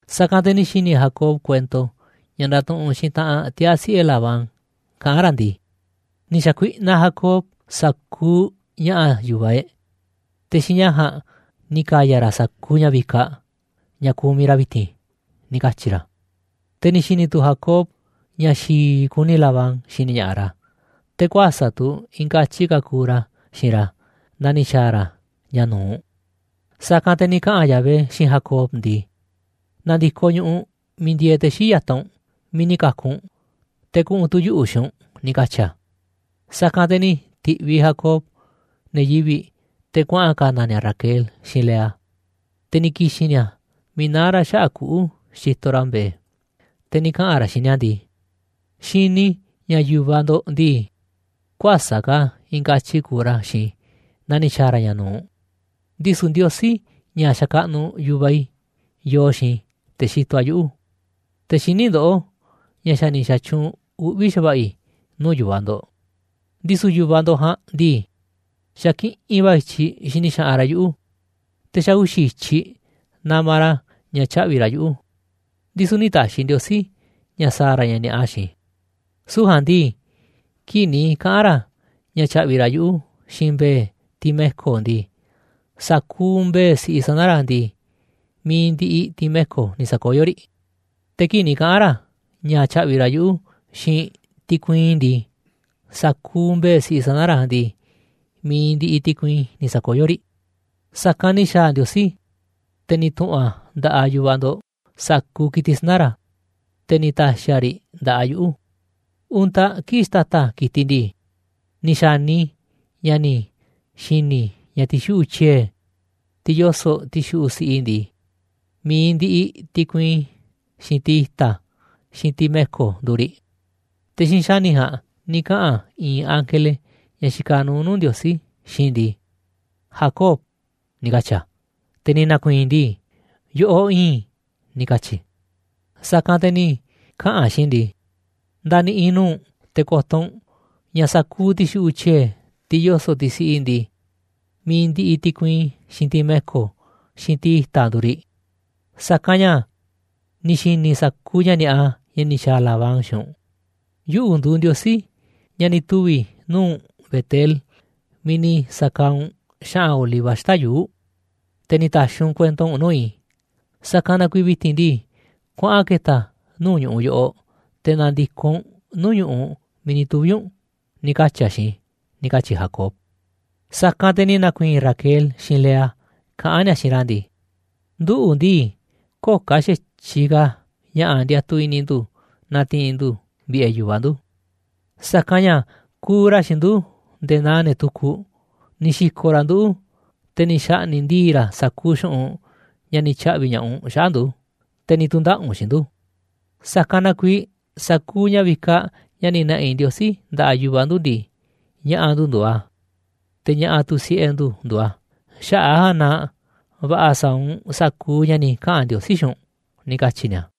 Sa̱kanꞌ te̱ ni̱ xi̱ni̱ Jacob kuento ña̱ ndatuꞌunꞌ xiinꞌ taꞌanꞌ tiaa̱ siꞌe̱ Labán kaꞌán ra̱ ndii: ―Ni̱ xa̱kuiꞌnaꞌ Jacob sa̱kuuꞌ ña̱ꞌa̱ yu̱vaꞌ e̱ꞌ, te̱ xiinꞌ ña̱ ja̱a̱nꞌ ni̱ ka̱ya̱ ra̱ sa̱kuuꞌ ña̱ vikaꞌ, ña̱ kumiꞌ ra̱ vi̱ti̱n ―ni̱ katyi̱ ra̱. Te̱ ni̱ xi̱ni̱ tu̱ Jacob ña̱ xi̱i̱ kuni Labán xini ña̱ꞌaꞌ ra̱, te̱ kuäsa̱ꞌ tu̱ i̱i̱n katyi ka̱ kuuꞌ ra̱ xiinꞌ ra̱ naa ni̱ xa̱a̱ ra̱ ña̱ nu̱uꞌ. Sa̱kanꞌ te̱ ni̱ kaꞌa̱n Yahvé xiinꞌ Jacob ndii: ―Na̱ndi̱koꞌ ñu̱ꞌuꞌ miiꞌ ndieeꞌ te̱ xii̱ꞌ ya̱taꞌ u̱nꞌ, miiꞌ ni̱ ka̱ku̱ u̱nꞌ, te̱ kuꞌu̱n tu̱ yuꞌu̱ xiinꞌ u̱nꞌ ―ni̱ katyi̱ a̱. Sa̱kanꞌ te̱ ni̱ ti̱ꞌviꞌ Jacob ne̱ yivi̱ꞌ te̱ kuaꞌa̱n ka̱na̱ ni̱a̱ Raquel xiinꞌ Lea, te̱ ni̱ ki̱xi̱n ni̱a̱ miiꞌ naá ra̱ xaꞌa̱ꞌ kuꞌu̱ xitoꞌ ra̱ mbe̱e̱, te̱ ni̱ kaꞌa̱n ra̱ xiinꞌ ni̱a̱ ndii: ―Xini i̱ ña̱ yu̱vaꞌ ndo̱ꞌ ndii, kuäsa̱ꞌ ka̱ i̱i̱n katyi kuuꞌ ra̱ xiinꞌ i̱ naa ni̱ xa̱a̱ ra̱ ña̱ nu̱uꞌ, ndisu̱ Ndiosí, ña̱ xakaꞌnuꞌ yu̱vaꞌ i̱, yoo xiinꞌ i̱, te̱ xitoꞌ a̱ yuꞌu̱. Te̱ xiní ndoꞌó ña̱ xa̱ ni̱ xa̱tyuunꞌ uꞌvi̱ xa̱va̱ꞌa̱ i̱ nuu̱ꞌ yu̱vaꞌ ndo̱ꞌ. Ndisu̱ yu̱vaꞌ ndo̱ꞌ ja̱a̱nꞌ ndii, xa̱ kiꞌinꞌ va̱ i̱tyiꞌ xini xaꞌanꞌ ra̱ yuꞌu̱, te̱ xa̱ uxi̱ i̱tyiꞌ namaꞌ ra̱ ña̱ tyaꞌvi̱ ra̱ yuꞌu̱. Ndisu̱ nï̱ ta̱xi̱ Ndiosí ña̱ sa̱a̱ ra̱ ña̱ ni̱a̱ꞌa xiinꞌ i̱, süu̱ꞌ ja̱a̱nꞌ ndii, kii̱ꞌ ni̱ kaꞌa̱n ra̱ ña̱ tya̱ꞌvi̱ ra̱ yuꞌu̱ xiinꞌ mbe̱e̱, tiꞌ me̱ko̱ ndii, sa̱kuuꞌ mbe̱e̱ siꞌi sana̱ ra̱ ndii, mi̱iꞌ ndiꞌiꞌ tiꞌ me̱ko̱ ni̱ sa̱koyó riꞌ. Te̱ kii̱ꞌ ni̱ kaꞌa̱n ra̱ ña̱ tya̱ꞌvi̱ ra̱ yuꞌu̱ xiinꞌ tiꞌ kuiin ndii, sa̱kuuꞌ mbe̱e̱ siꞌi sana̱ ra̱ ndii, mi̱iꞌ ndiꞌiꞌ tiꞌ kuiin ni̱ sa̱koyó riꞌ. Sa̱kanꞌ ni̱ xa̱a̱ Ndiosí, te̱ ni̱ tu̱ꞌu̱n a̱ nda̱ꞌaꞌ yu̱vaꞌ ndo̱ꞌ sa̱kuuꞌ ki̱tiꞌ sana̱ ra̱, te̱ ni̱ ta̱xi̱ a̱ riꞌ nda̱ꞌaꞌ yuꞌu̱. Untaꞌ kii̱ꞌ xtata̱ ki̱tiꞌ ndii, ni̱ xa̱ni i̱ ña̱ ni̱ xi̱ni̱ i̱ ña̱ ti̱xuꞌu̱ꞌ tyie̱, tiꞌ yoso̱ꞌ ti̱xuꞌu̱ꞌ siꞌi ndii, mi̱iꞌ ndiꞌiꞌ tiꞌ kuiin, xiinꞌ tiꞌ i̱ta̱, xiinꞌ tiꞌ me̱ko̱ nduuꞌ riꞌ. Te̱ xiinꞌ xa̱ni̱ ja̱a̱nꞌ ni̱ kaꞌa̱n i̱i̱n ángele, ña̱ xikaꞌ nuuꞌ nuu̱ꞌ Ndiosí, xiinꞌ i̱ ndii: “Jacob”, ni̱ katyi̱ a̱. Te̱ ni̱ na̱ku̱i̱i̱n i̱ ndii: “Yoꞌoꞌ iinꞌ i̱”, ni̱ katyi̱ i̱. Sa̱kanꞌ te̱ ni̱ kaꞌa̱n a̱ xiinꞌ i̱ ndii: “Nda̱ni̱ꞌi̱ nuu̱ꞌ u̱nꞌ te̱ ko̱to̱ u̱nꞌ ña̱ sa̱kuuꞌ ti̱xuꞌu̱ꞌ tyie̱, tiꞌ yoso̱ꞌ tiꞌ siꞌi ndii, mi̱iꞌ ndiꞌiꞌ tiꞌ kuiin, xiinꞌ tiꞌ me̱ko̱, xiinꞌ tiꞌ i̱ta̱ nduuꞌ riꞌ, sa̱kanꞌ ña̱ ni̱ xi̱ni̱ i̱ sa̱kuuꞌ ña̱ ni̱a̱ꞌa, ña̱ ni̱ xa̱a̱ Labán xiinꞌ u̱nꞌ. Yuꞌu̱ nduuꞌ Ndiosí, ña̱ ni̱ tuvi̱ nuu̱ꞌ u̱nꞌ Betel miiꞌ ni̱ sa̱kaaꞌ u̱nꞌ xa̱ꞌa̱n oliva xata̱ꞌ yuu̱ꞌ, te̱ ni̱ ta̱xi̱ u̱nꞌ kuento u̱nꞌ nuu̱ꞌ i̱. Sa̱kanꞌ na kuiiꞌ vi̱ti̱n ndii, kuaꞌan ke̱ta̱ nuu̱ꞌ ñu̱ꞌuꞌ yoꞌoꞌ, te̱ na̱ndi̱koꞌ u̱nꞌ nuu̱ꞌ ñu̱ꞌuꞌ miiꞌ ni̱ tuvi̱ u̱nꞌ”, ni̱ katyi̱ a̱ xiinꞌ i̱ ―ni̱ katyi̱ Jacob. Sa̱kanꞌ te̱ ni̱ na̱ku̱i̱i̱n Raquel xiinꞌ Lea kaꞌán ni̱a̱ xiinꞌ ra̱ ndii: ―Nduꞌu̱ ndii, köo̱ꞌ ka̱ xa̱tyiꞌ ka̱ ña̱ꞌa̱ ndiatuꞌ i̱ni̱ ndu̱ na̱ti̱i̱n ndu̱ vi̱ꞌe̱ yu̱vaꞌ ndu̱. Sa̱kanꞌ ña̱ kuuꞌ ra̱ xiinꞌ ndu̱ nde̱e̱ naa ne̱ tukuꞌ, ni̱ xi̱ko̱ꞌ ra̱ nduꞌu̱, te̱ ni̱ xa̱ꞌni̱ꞌ ndii̱ꞌ ra̱ sa̱kuuꞌ xu̱ꞌunꞌ ña̱ ni̱ tya̱ꞌvi̱ ña̱ꞌaꞌ u̱nꞌ xaꞌa̱ꞌ ndu̱, te̱ ni̱ tu̱ndaꞌa̱ꞌ u̱nꞌ xiinꞌ ndu̱. Sa̱kanꞌ na kuiiꞌ sa̱kuuꞌ ña̱ vikaꞌ ña̱ ni̱ na̱ꞌi̱ Ndiosí nda̱ꞌaꞌ yu̱vaꞌ ndu̱ ndii, ña̱ꞌa̱ ndu̱ nduuꞌ a̱, te̱ ña̱ꞌa̱ tu̱ siꞌe̱ ndu̱ nduuꞌ a̱, xaꞌa̱ꞌ a̱ ja̱a̱nꞌ na va̱ꞌa̱ sa̱a̱ u̱nꞌ sa̱kuuꞌ ña̱ ni̱ kaꞌa̱n Ndiosí xiinꞌ u̱nꞌ ―ni̱ katyi̱ ni̱a̱.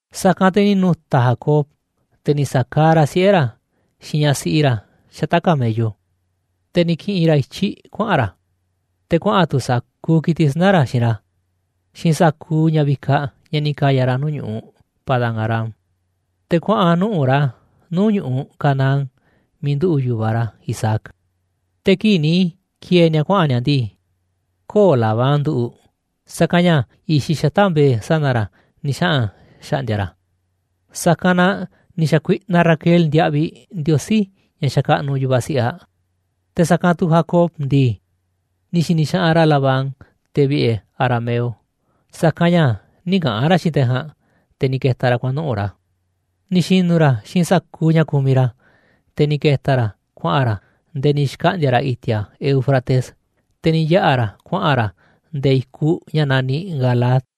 Sa̱kanꞌ te̱ ni̱ nu̱ta̱ Jacob, te̱ ni̱ sa̱kaaꞌ ra̱ siꞌe̱ ra̱ xiinꞌ ñaꞌ siꞌi ra̱ xata̱ꞌ camello, te̱ ni̱ ki̱ꞌi̱n ra̱ i̱tyiꞌ kuaꞌa̱n ra̱, te̱ kuaꞌa̱n tu̱ sa̱kuuꞌ ki̱tiꞌ sana̱ ra̱ xiinꞌ ra̱, xiinꞌ sa̱kuuꞌ ña̱ vikaꞌ ña̱ ni̱ ka̱ya̱ ra̱ nuu̱ꞌ ñu̱ꞌuꞌ Padán-arám. Te̱ kuaꞌa̱n nuꞌu̱ꞌ ra̱ nuu̱ꞌ ñu̱ꞌuꞌ Canaán miiꞌ nduꞌu̱ꞌ yu̱vaꞌ ra̱ Isaac. Te̱ kii̱ꞌ ni̱ ki̱e̱e̱ ni̱a̱ kuaꞌa̱n ni̱a̱ ndii, köo̱ꞌ Labán nduꞌu̱ꞌ, sa̱kanꞌ ña̱ i̱xiꞌ xata̱ꞌ mbe̱e̱ sana̱ ra̱ ni̱ xaꞌa̱n xa̱ꞌndi̱a̱ ra̱. Sa̱kanꞌ na ni̱ xa̱kuiꞌnaꞌ Raquel ndiaꞌviꞌ ndiosí ña̱ xakaꞌnuꞌ yu̱vaꞌ siꞌiꞌ aꞌ. Te̱ sa̱kanꞌ tu̱ Jacob ndii, ni̱ xi̱ni̱ xaꞌanꞌ ra̱ Labán, te̱ vi̱ꞌe̱ arameo, sa̱kanꞌ ña̱ nï̱ kaꞌa̱n ra̱ xiinꞌ te̱ ja̱a̱nꞌ, te̱ ni̱ ke̱ta̱ ra̱ kuaꞌa̱n nuꞌu̱ꞌ ra̱. Ni̱ xi̱nu̱ ra̱ xiinꞌ sa̱kuuꞌ ña̱ ku̱miꞌ ra̱, te̱ ni̱ ke̱ta̱ ra̱ kuaꞌa̱n ra̱ nde̱e̱ ni̱ xkaꞌndi̱a̱ ra̱ i̱ti̱a̱ Éufrates, te̱ ni̱ yaꞌa̱ ra̱ kuaꞌa̱n ra̱ nde̱e̱ i̱kuꞌ ña̱ naniꞌ Galaad.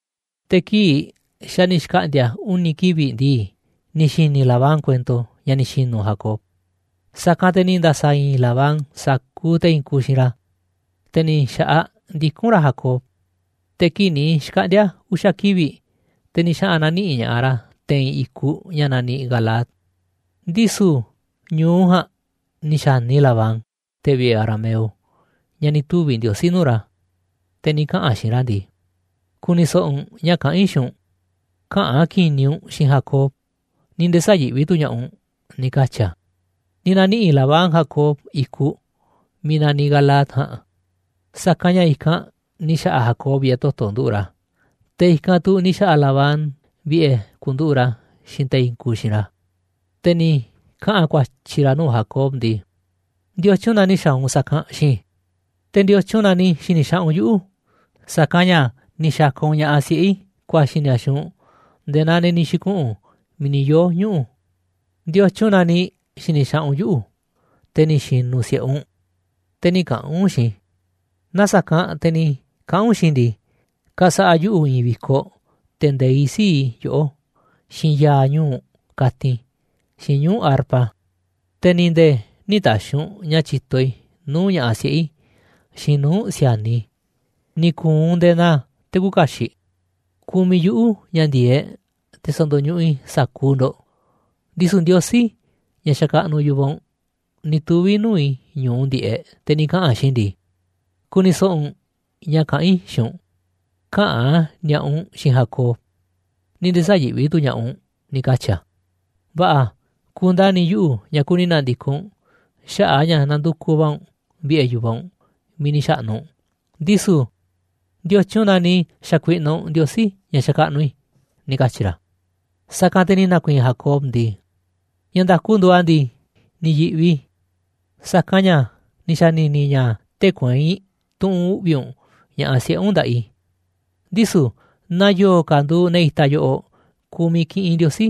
Te̱ kii̱ꞌ xa̱ ni̱ xkaꞌndi̱a̱ uni̱ kivi̱ꞌ ndii, ni̱ xi̱ni̱ Labán kuento ña̱ ni̱ xi̱nu̱ Jacob. Sa̱kanꞌ te̱ ni̱ nda̱sa̱ i̱i̱n Labán sa̱kuuꞌ te̱ i̱i̱n kuuꞌ xiinꞌ ra̱, te̱ ni̱ xa̱ꞌaꞌ ndikún ra̱ Jacob. Te̱ kii̱ꞌ ni̱ xkaꞌndi̱a̱ uxa̱ kivi̱ꞌ, te̱ ni̱ xaꞌa̱n na̱niꞌi̱ꞌ ña̱ꞌaꞌ ra̱ te̱i̱n i̱kuꞌ ña̱ naniꞌ Galaad. Ndisu̱ ñu̱u ja̱a̱nꞌ ni̱ xa̱ni Labán, te̱ vi̱ꞌe̱ arameo, ña̱ ni̱ tuvi̱ Ndiosí nuu̱ꞌ ra̱, te̱ ni̱ kaꞌa̱n a̱ xiinꞌ ra̱ ndii: ―Ku̱ni̱ so̱ꞌo̱ u̱nꞌ ña̱ kaꞌán i̱ xiinꞌ u̱nꞌ, käꞌa̱n ki̱ni̱ u̱nꞌ xiinꞌ Jacob, ni̱ nde̱e̱ sä̱yi̱ꞌvi tu̱ ña̱ꞌaꞌ u̱nꞌ ―ni̱ katyi̱ a̱. Ni̱ na̱niꞌi̱ꞌ Labán Jacob i̱kuꞌ miiꞌ naniꞌ Galaad ja̱a̱nꞌ, sa̱kanꞌ ña̱ i̱kanꞌ ni̱ xa̱ꞌa̱ Jacob vi̱ꞌe̱ toto̱ nduꞌu̱ꞌ ra̱, te̱ i̱kanꞌ tu̱ ni̱ xa̱ꞌa̱ Labán vi̱ꞌe̱ ku̱nduꞌu̱ꞌ ra̱ xiinꞌ te̱ i̱i̱n kuuꞌ xiinꞌ ra̱. Te̱ ni̱ kaꞌa̱n ku̱a̱tyi̱ ra̱ nuu̱ꞌ Jacob ndii: ―¿Ndiotyun na ni̱ xa̱a̱ u̱nꞌ sa̱kanꞌ xiinꞌ i̱? ¿Te̱ ndiotyun na ni̱ xi̱ni̱ xaꞌanꞌ u̱nꞌ yuꞌu̱? Sa̱kanꞌ ña̱ ni̱ xa̱ka̱ u̱nꞌ ña̱ꞌaꞌ siꞌe̱ i̱ ku̱a̱xi̱ ni̱a̱ xiinꞌ u̱nꞌ nde̱e̱ naa ne̱ ni̱ xi̱kuꞌu̱n miiꞌ ni̱ yoo̱ ñuꞌu̱. ¿Ndiotyun na ni̱ xi̱ni̱ xaꞌanꞌ u̱nꞌ yuꞌu̱, te̱ ni̱ xi̱nu̱ si̱ꞌe u̱nꞌ, te̱ nï̱ kaꞌa̱n u̱nꞌ xiinꞌ i̱? Naaꞌ sa̱kanꞌ te̱ ni̱ kaꞌa̱n u̱nꞌ xiinꞌ i̱ ndii, ka̱sa̱ꞌa̱ yuꞌu̱ i̱i̱n vi̱koꞌ te̱ nde̱iꞌ sii̱ꞌ i̱ yoꞌó, xiinꞌ ya̱a̱ ñuu̱ꞌ katin, xiinꞌ ñuu̱ꞌ arpa. Te̱ ni̱ nde̱e̱ nï̱ ta̱xi̱ u̱nꞌ ña̱ tyi̱to i̱ nuu̱ꞌ ña̱ꞌaꞌ siꞌe̱ i̱ xiinꞌ nuu̱ꞌ si̱a̱niꞌ i̱, ni̱ ku̱u̱ u̱nꞌ nde̱e̱ naa te̱ küuꞌ kaxiꞌ. Kumiꞌ yuꞌu̱ ña̱ ndi̱e̱eꞌ te̱ sa̱ndo̱ñuꞌuꞌ i̱ sa̱kuuꞌ ndo̱ꞌ, ndisu̱ Ndiosí, ña̱ xakaꞌnuꞌ yu̱vaꞌ u̱nꞌ, ni̱ tuvi̱ nuu̱ꞌ i̱ ñu̱u ndiꞌe̱ꞌ, te̱ ni̱ kaꞌa̱n a̱ xiinꞌ i̱ ndii: “Ku̱ni̱ so̱ꞌo̱ u̱nꞌ ña̱ kaꞌán i̱ xiinꞌ u̱nꞌ, käꞌa̱n ni̱a̱ꞌa u̱nꞌ xiinꞌ Jacob, ni̱ nde̱e̱ sä̱yi̱ꞌvi tu̱ ña̱ꞌaꞌ u̱nꞌ”, ni̱ katyi̱ a̱. Va̱ꞌa̱, ku̱ndani̱ yuꞌu̱ ña̱ kuni na̱ndi̱koꞌ u̱nꞌ xaꞌa̱ꞌ a̱ ña̱ nandukuꞌ va̱ u̱nꞌ vi̱ꞌe̱ yu̱vaꞌ u̱nꞌ miiꞌ ni̱ xa̱ꞌnu̱ u̱nꞌ, ndisu̱ ¿ndiotyun na ni̱ xa̱kuiꞌnaꞌ u̱nꞌ ndiosí ña̱ xakaꞌnuꞌ i̱ ―ni̱ katyi̱ ra̱. Sa̱kanꞌ te̱ ni̱ na̱ku̱i̱i̱n Jacob ndii: ―Ña̱ nda̱ku nduuꞌ a̱ ndii, ni̱ yi̱ꞌvi i̱, sa̱kanꞌ ña̱ ni̱ xa̱ni̱ni̱ i̱ ña̱ tee̱ꞌ kueinꞌ tu̱ꞌu̱n uꞌvi̱ u̱nꞌ ña̱ꞌaꞌ siꞌe̱ u̱nꞌ nda̱ꞌaꞌ i̱. Ndisu̱ naaꞌ yo̱o̱ ka̱ nduuꞌ ne̱ itaꞌ yoꞌoꞌ kumiꞌ kiꞌinꞌ ndiosí,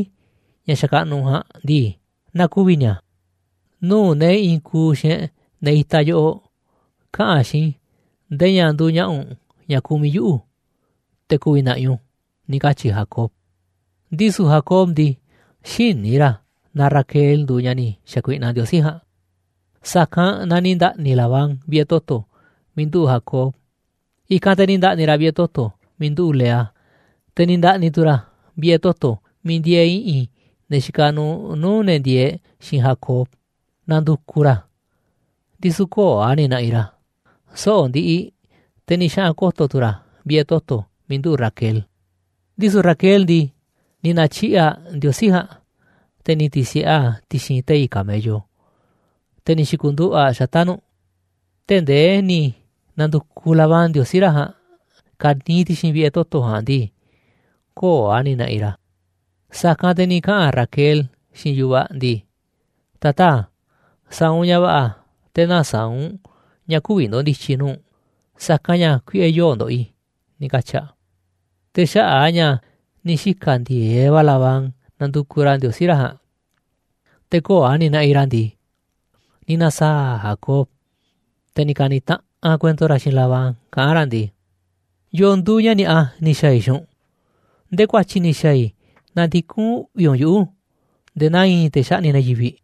ña̱ xakaꞌnuꞌ u̱nꞌ ja̱a̱nꞌ ndii, na ku̱vi̱ ni̱a̱. Nuu̱ꞌ ne̱ i̱i̱n kuuꞌ xiinꞌ e̱ꞌ ne̱ itaꞌ yoꞌoꞌ, kaꞌa̱n xiinꞌ i̱ nde̱e̱ ña̱ nduuꞌ ña̱ꞌa̱ u̱nꞌ ña̱ kumiꞌ yuꞌu̱, te̱ ku̱vi̱ na̱ꞌi̱ u̱nꞌ u̱n ―ni̱ katyi̱ Jacob Ndisu̱ Jacob ndii, xïní ra̱ na Raquel nduuꞌ ñaꞌ ni̱ xa̱kuiꞌnaꞌ ndiosí ja̱a̱nꞌ. Sa̱kanꞌ na ni̱ nda̱ꞌni̱ Labán vi̱ꞌe̱ toto̱ miiꞌ nduꞌu̱ꞌ Jacob, i̱kanꞌ te̱ ni̱ nda̱ꞌni̱ ra̱ vi̱ꞌe̱ toto̱ miiꞌ nduꞌu̱ꞌ Lea, te̱ ni̱ nda̱ꞌni̱ tu̱ ra̱ vi̱ꞌe̱ toto̱ miiꞌ ndieeꞌ i̱ꞌi̱n ne̱ xikaꞌ nuuꞌ nuu̱ꞌ ne̱ ndieeꞌ xiinꞌ Jacob, nandukuꞌ ra̱ a̱, ndisu̱ köo̱ꞌ a̱ ni̱ na̱ꞌi̱ ra̱. Soꞌo̱ꞌ ndiꞌiꞌ te̱ ni̱ xaꞌa̱n ko̱to̱ tu̱ ra̱ vi̱ꞌe̱ toto̱ miiꞌ nduꞌu̱ꞌ Raquel. Ndisu̱ Raquel ndii, ni̱ na̱tyiꞌi̱ꞌ aꞌ ndiosí ja̱a̱nꞌ, te̱ ni̱ ti̱si̱ꞌe aꞌ ti̱xi̱n tei̱ camello, te̱ ni̱ xi̱ku̱nduꞌu̱ꞌ aꞌ xata̱ꞌ nu̱ꞌ. Tee̱ꞌ ndee ni̱ na̱ndu̱kuꞌ Labán ndiosí ra̱ ja̱a̱nꞌ ka̱niiꞌ ti̱xi̱n vi̱ꞌe̱ toto̱ ja̱a̱nꞌ ndii, köo̱ꞌ a̱ ni̱ na̱ꞌi̱ ra̱. Sa̱kanꞌ te̱ ni̱ kaꞌa̱n Raquel xiinꞌ yu̱vaꞌ aꞌ ndii: ―Tataa̱, sa̱a̱ u̱nꞌ ña̱ va̱ꞌa̱ te̱ nä̱saa̱ꞌ u̱nꞌ ña̱ kü̱vi̱ ndo̱ndi̱tyi̱ i̱ nuu̱ꞌ u̱nꞌ, sa̱kanꞌ ña̱ kuiꞌe̱ yoo̱ꞌ ndoꞌoꞌ i̱ ―ni̱ katyi̱ aꞌ. Te̱ xaꞌa̱ꞌ a̱ ña̱ ni̱ xika̱ ndi̱e̱eꞌ va̱ Labán nandukuꞌ ra̱ ndiosí ra̱ ja̱a̱nꞌ, te̱ köo̱ꞌ a̱ ni̱ naꞌiꞌ ra̱ ndii, ni̱ na̱saa̱ꞌ Jacob, te̱ ni̱ ka̱ni̱ taꞌanꞌ kuento ra̱ xiinꞌ Labán kaꞌán ra̱ ndii: ―¿Yo̱o̱ nduuꞌ ña̱ ni̱a̱ꞌa ni̱ xa̱a̱ i̱ xiinꞌ u̱nꞌ? ¿Ndee ku̱a̱tyi̱ ni̱ xa̱a̱ i̱ na ndikún uꞌvi̱ u̱nꞌ yuꞌu̱ ndee naa i̱i̱n te̱ xaꞌni̱ꞌ ne̱ yivi̱ꞌ.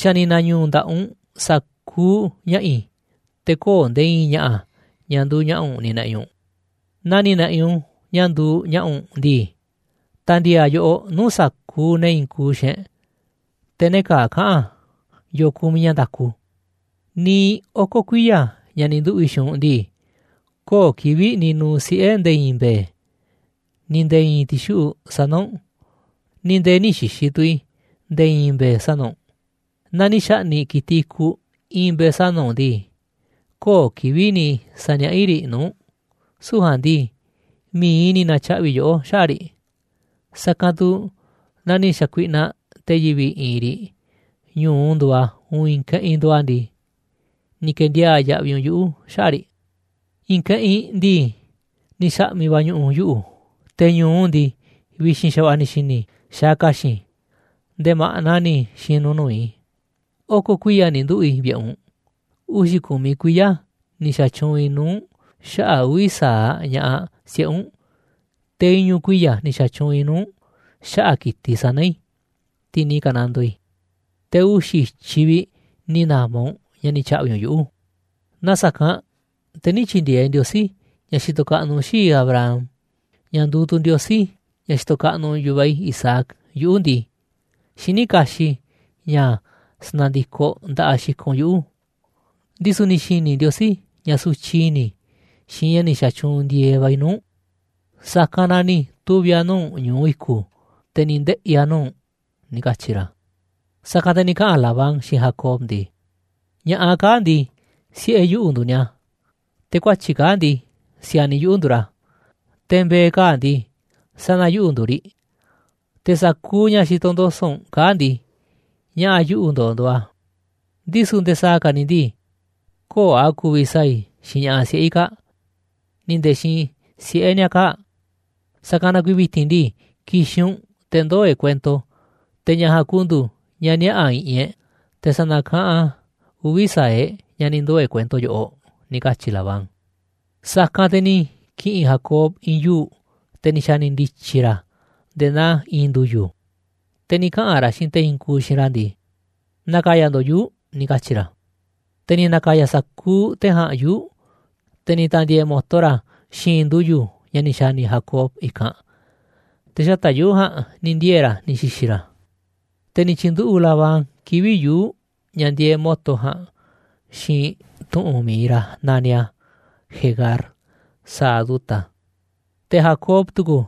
Xa̱ ni̱ na̱ñu̱u̱ nda̱ꞌaꞌ u̱nꞌ sa̱kuuꞌ ña̱ꞌa̱ i̱, te̱ köo̱ꞌ nde̱e̱ i̱i̱n ña̱ꞌa̱, ña̱ nduuꞌ ña̱ꞌa̱ u̱nꞌ ni̱ na̱ꞌi̱ u̱nꞌ. Naaꞌ ni̱ na̱ꞌi̱ u̱nꞌ ña̱ nduuꞌ ña̱ꞌa̱ u̱nꞌ ndii, ta̱ndi̱e̱e̱ a̱ yoꞌoꞌ nuu̱ꞌ sa̱kuuꞌ ne̱ i̱i̱n kuuꞌ xiinꞌ e̱ꞌ, te̱ ne̱ kaa̱ꞌ kaꞌa̱n yo̱o̱ kumiꞌ ña̱ nda̱ku. Niiꞌ oko̱ kuiya̱ ña̱ ni̱ nduꞌu̱ꞌ i̱ xiinꞌ u̱nꞌ ndii, köo̱ꞌ kivi̱ꞌ ni̱ nu̱u̱ siꞌe̱ nde̱e̱ i̱i̱n mbe̱e̱, ni̱ nde̱e̱ i̱i̱n ti̱xuꞌu̱ꞌ sana̱ u̱nꞌ, ni̱ nde̱e̱ nï̱ xi̱xi̱ tu̱ i̱ nde̱e̱ i̱i̱n mbe̱e̱ sana̱ u̱nꞌ. Naaꞌ ni̱ xa̱ꞌni̱ꞌ ki̱tiꞌ i̱kuꞌ i̱i̱n mbe̱e̱ sana̱ u̱nꞌ ndii, köo̱ꞌ kivi̱ꞌ ni̱ sa̱niaꞌá i̱ riꞌ nuu̱ꞌ u̱nꞌ, süu̱ꞌ ja̱a̱nꞌ ndii mi̱iꞌ i̱ ni̱ na̱tyaꞌvi̱ yoꞌó xaꞌa̱ꞌ riꞌ, sa̱kanꞌ tu̱ naaꞌ ni̱ xa̱kuiꞌnaꞌ te̱ yivi̱ꞌ i̱i̱n riꞌ ñu̱u nduuꞌ a̱, uun i̱i̱n keꞌinꞌ nduuꞌ a̱ ndii, ni̱ ke̱ndiaa̱ꞌ yaꞌviꞌ u̱nꞌ yuꞌu̱ xaꞌa̱ꞌ riꞌ. I̱i̱n keꞌinꞌ ndii, ni̱ xa̱ꞌmi̱ va̱ ñu̱ꞌu̱ yuꞌu̱, te̱ ñu̱u ndii, vi̱xi̱n xa̱va̱ꞌa̱ ni̱ xi̱ni̱ i̱ xaaꞌ ka̱xi̱n, nde̱e̱ ma̱ꞌna ni̱ xi̱nu̱ nuu̱ꞌ i̱. Oko̱ kuiya̱ ni̱ nduꞌu̱ꞌ i̱ vi̱ꞌe̱ u̱nꞌ, uxi̱ ku̱miꞌ kuiya̱ ni̱ xa̱tyuunꞌ i̱ nuu̱ꞌ u̱nꞌ xaꞌa̱ꞌ uvi̱ sa̱aꞌ ña̱ꞌaꞌ siꞌe̱ u̱nꞌ, te̱ iñu̱ kuiya̱ ni̱ xa̱tyuunꞌ i̱ nuu̱ꞌ u̱nꞌ xaꞌa̱ꞌ ki̱tiꞌ sana̱ i̱, tiꞌ ni̱ ka̱nandoo i̱, te̱ uxi̱ i̱tyiꞌ vi̱ꞌ ni̱ na̱ma̱ u̱nꞌ ña̱ ni̱ tya̱ꞌvi̱ u̱nꞌ yuꞌu̱. Naaꞌ sa̱kanꞌ te̱ nï̱ tyi̱ndi̱e̱eꞌ Ndiosí, ña̱ xitoꞌ kaꞌnuꞌ xii̱ꞌ i̱ Abraham, ña̱ nduuꞌ tu̱ Ndiosí, ña̱ xitoꞌ kaꞌnuꞌ yu̱vaꞌ i̱ Isaac, yuꞌu̱ ndii, xiní kaxiꞌ i̱ ña̱ sa̱na̱ndikoꞌ nda̱ꞌaꞌ xikoꞌ u̱nꞌ yuꞌu̱. Ndisu̱ ni̱ xi̱ni̱ Ndiosí ña̱ sutyiꞌ i̱ni̱ i̱ xiinꞌ ña̱ ni̱ xa̱tyuunꞌ ndi̱e̱eꞌ va̱ i̱ nuu̱ꞌ u̱nꞌ, sa̱kanꞌ na ni̱ tuvi̱ a̱ nuu̱ꞌ u̱nꞌ ñu̱u i̱ku̱, te̱ ni̱ ndeꞌi̱ a̱ nuu̱ꞌ u̱nꞌ ―ni̱ katyi̱ ra̱. Sa̱kanꞌ te̱ ni̱ kaꞌa̱n Labán xiinꞌ Jacob ndii: ―Ña̱ꞌaꞌ kaa̱ꞌ ndii, siꞌe̱ yuꞌu̱ nduuꞌ ni̱a̱, te̱ kuatyi̱ꞌ kaa̱ꞌ ndii, si̱a̱niꞌ yuꞌu̱ nduuꞌ ra̱, te̱ mbe̱e̱ kaa̱ꞌ ndii, sana̱ yuꞌu̱ nduuꞌ riꞌ. Te̱ sa̱kuuꞌ ña̱ xitoꞌ ndo̱so̱ꞌ u̱nꞌ kaa̱ꞌ ndii, ña̱ꞌa̱ yuꞌu̱ ndo̱o̱ nduuꞌ a̱. Ndisu̱ nde̱e̱ sa̱a̱ ka̱ ni̱ ndii, köo̱ꞌ a̱ ku̱vi̱ sa̱a̱ i̱ xiinꞌ ña̱ꞌaꞌ siꞌe̱ i̱ kaa̱ꞌ, ni̱ nde̱e̱ xiinꞌ siꞌe̱ ni̱a̱ kaa̱ꞌ. Sa̱kanꞌ na kuiiꞌ vi̱ti̱n ndii, ki̱xi̱n u̱nꞌ te̱ ndoo̱ e̱ꞌ kuento, te̱ ña̱ ja̱a̱nꞌ ku̱ndu̱u̱ ña̱ niaꞌa̱ i̱ꞌi̱n e̱ꞌ, te̱ sa̱na̱kaꞌanꞌ a̱ uvi̱ sa̱aꞌ e̱ꞌ ña̱ ni̱ ndoo̱ e̱ꞌ kuento yoꞌoꞌ ―ni̱ katyi̱ Labán. Sa̱kanꞌ te̱ ni̱ ki̱ꞌi̱n Jacob i̱i̱n yuu̱ꞌ, te̱ ni̱ xa̱ni̱ ndi̱tyi̱ ra̱ a̱ nde̱e̱ naa i̱i̱n ndu̱yu̱, te̱ ni̱ kaꞌa̱n ra̱ xiinꞌ te̱ i̱i̱n kuuꞌ xiinꞌ ra̱ ndii: ―Na̱ka̱ya̱ ndo̱ꞌ yuu̱ꞌ ―ni̱ katyi̱ ra̱. Te̱ ni̱ na̱ka̱ya̱ sa̱kuuꞌ te̱ ja̱a̱nꞌ yuu̱ꞌ, te̱ ni̱ ta̱ndi̱e̱e̱ mo̱to ra̱ a̱ xi̱i̱nꞌ ndu̱yu̱ ña̱ ni̱ xa̱ni̱ Jacob i̱kanꞌ, te̱ xata̱ꞌ yuu̱ꞌ ja̱a̱nꞌ ni̱ ndiee̱ ra̱ ni̱ xi̱xi̱ ra̱. Te̱ ni̱ tyi̱nduꞌu̱ꞌ Labán kivi̱ꞌ yuu̱ꞌ ña̱ ndieeꞌ mo̱to ja̱a̱nꞌ xiinꞌ tu̱ꞌu̱n mi̱iꞌ ra̱ naniꞌ a̱ Jegar Sahaduta, te̱ Jacob tu̱ku̱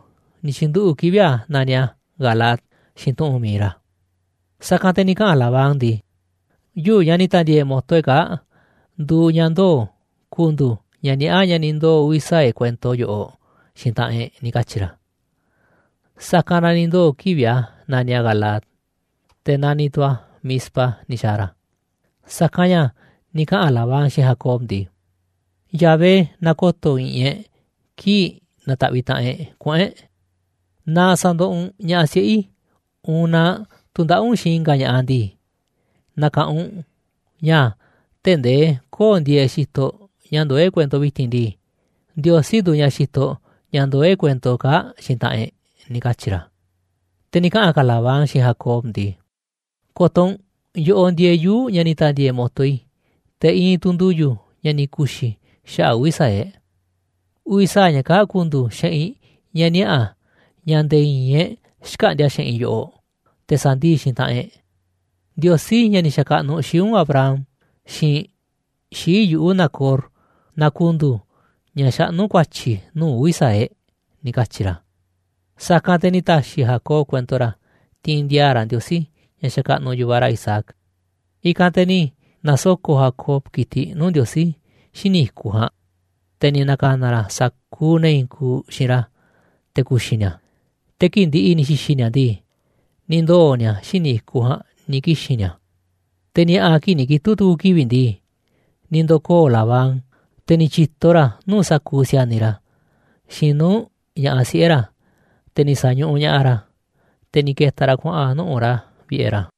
ni̱ tyi̱nduꞌu̱ꞌ kivi̱ꞌ a̱ naniꞌ a̱ Galaad, xiinꞌ tu̱ꞌu̱n mi̱iꞌ ra̱. Sa̱kanꞌ te̱ ni̱ kaꞌa̱n Labán ndii. ―Yuu̱ꞌ, ña̱ ni̱ na̱ta̱ndi̱e̱e̱ mo̱to e̱ꞌ kaa̱ꞌ, nduuꞌ ña̱ ndoo̱ ku̱ndu̱u̱ ña̱ niaꞌá ña̱ ni̱ ndoo̱ uvi̱ sa̱aꞌ e̱ꞌ kuento yoꞌoꞌ xiinꞌ taꞌanꞌ e̱ꞌ ―ni̱ katyi̱ ra̱. Sa̱kanꞌ na ni̱ ndoo̱ kivi̱ꞌ a̱ naniꞌ a̱ Galaad, te̱ naniꞌ tu̱ a̱ Mizpa ni̱ xa̱a̱ ra̱. Sa̱kanꞌ ña̱ ni̱ kaꞌa̱n Labán xiinꞌ Jacob ndii: ―Yahvé na ko̱to̱ i̱ꞌi̱n e̱ꞌ kii̱ꞌ na̱ta̱ꞌviꞌ taꞌanꞌ e̱ꞌ kuꞌu̱n e̱ꞌ. Naaꞌ sa̱ndoꞌoꞌ u̱nꞌ ña̱ꞌaꞌ siꞌe̱ i̱, uun naaꞌ tu̱ndaꞌa̱ꞌ u̱nꞌ xiinꞌ i̱nga̱ ña̱ꞌaꞌ ndii, na̱ka̱ꞌanꞌ u̱nꞌ ña̱ tee̱ꞌ ndee köo̱ꞌ ndieeꞌ xitoꞌ ña̱ ndoó e̱ꞌ kuento vi̱ti̱n ndii, Ndiosí nduuꞌ ña̱ xitoꞌ ña̱ ndoó e̱ꞌ kuento kaa̱ꞌ xiinꞌ taꞌanꞌ e̱ꞌ ―ni̱ katyi̱ ra̱. Te̱ ni̱ kaꞌa̱n ka̱ Labán xiinꞌ Jacob ndii. ―Ko̱to̱ u̱nꞌ, yoꞌoꞌ ndieeꞌ yuu̱ꞌ ña̱ ni̱ ta̱ndi̱e̱e̱ mo̱to i̱, te̱ iinꞌ tu̱ ndu̱yu̱ ña̱ ni̱ ku̱xi̱ i̱ xaꞌa̱ꞌ uvi̱ sa̱aꞌ e̱ꞌ. Uvi̱ sa̱aꞌ ña̱ kaa̱ꞌ ku̱ndu̱u̱ xeꞌinꞌ ña̱ niaꞌa̱ ña̱ nde̱e̱ i̱i̱n e̱ꞌ xkäꞌndi̱a̱ xeꞌinꞌ yoꞌoꞌ, te̱ sa̱ndii̱ꞌ xiinꞌ taꞌanꞌ e̱ꞌ. Ndiosí, ña̱ ni̱ xa̱kaꞌnuꞌ xii̱ꞌ u̱nꞌ Abraham xiinꞌ xii̱ꞌ yuꞌu̱ Nacor, na ku̱ndu̱u̱ ña̱ xaꞌnú ku̱a̱tyi̱ nuu̱ꞌ uvi̱ sa̱aꞌ e̱ꞌ ―ni̱ katyi̱ ra̱. Sa̱kanꞌ te̱ ni̱ ta̱xi̱ Jacob kuento ra̱ tiinꞌ ndi̱a̱a̱ ra̱ Ndiosí, ña̱ xakaꞌnuꞌ yu̱vaꞌ ra̱ Isaac. I̱kanꞌ te̱ ni̱ na̱soko̱ꞌ Jacob ki̱tiꞌ nuu̱ꞌ Ndiosí xíniꞌ i̱kuꞌ ja̱a̱nꞌ, te̱ ni̱ na̱ka̱na̱ ra̱ sa̱kuuꞌ ne̱ i̱i̱n kuuꞌ xiinꞌ ra̱ te̱ ku̱xi̱ ni̱a̱. Te̱ kii̱ꞌ ndi̱ꞌi̱ ni̱ xi̱xi̱ ni̱a̱ ndii, ni̱ ndoo̱ ni̱a̱ xíniꞌ i̱kuꞌ ja̱a̱nꞌ ni̱ kixi̱n ni̱a̱. Te̱ ni̱a̱ꞌa̱ kii̱ꞌ ni̱ kitu̱ꞌ tu̱ku̱ kivi̱ꞌ ndii, ni̱ ndo̱koo̱ Labán, te̱ ni̱ tyi̱to ra̱ nuu̱ꞌ sa̱kuuꞌ si̱a̱niꞌ ra̱, xiinꞌ nuu̱ꞌ ña̱ꞌaꞌ siꞌe̱ ra̱, te̱ ni̱ sa̱ñuꞌuꞌ ña̱ꞌaꞌ ra̱, te̱ ni̱ ke̱ta̱ ra̱ kuaꞌa̱n nuꞌu̱ꞌ ra̱ vi̱ꞌe̱ ra̱.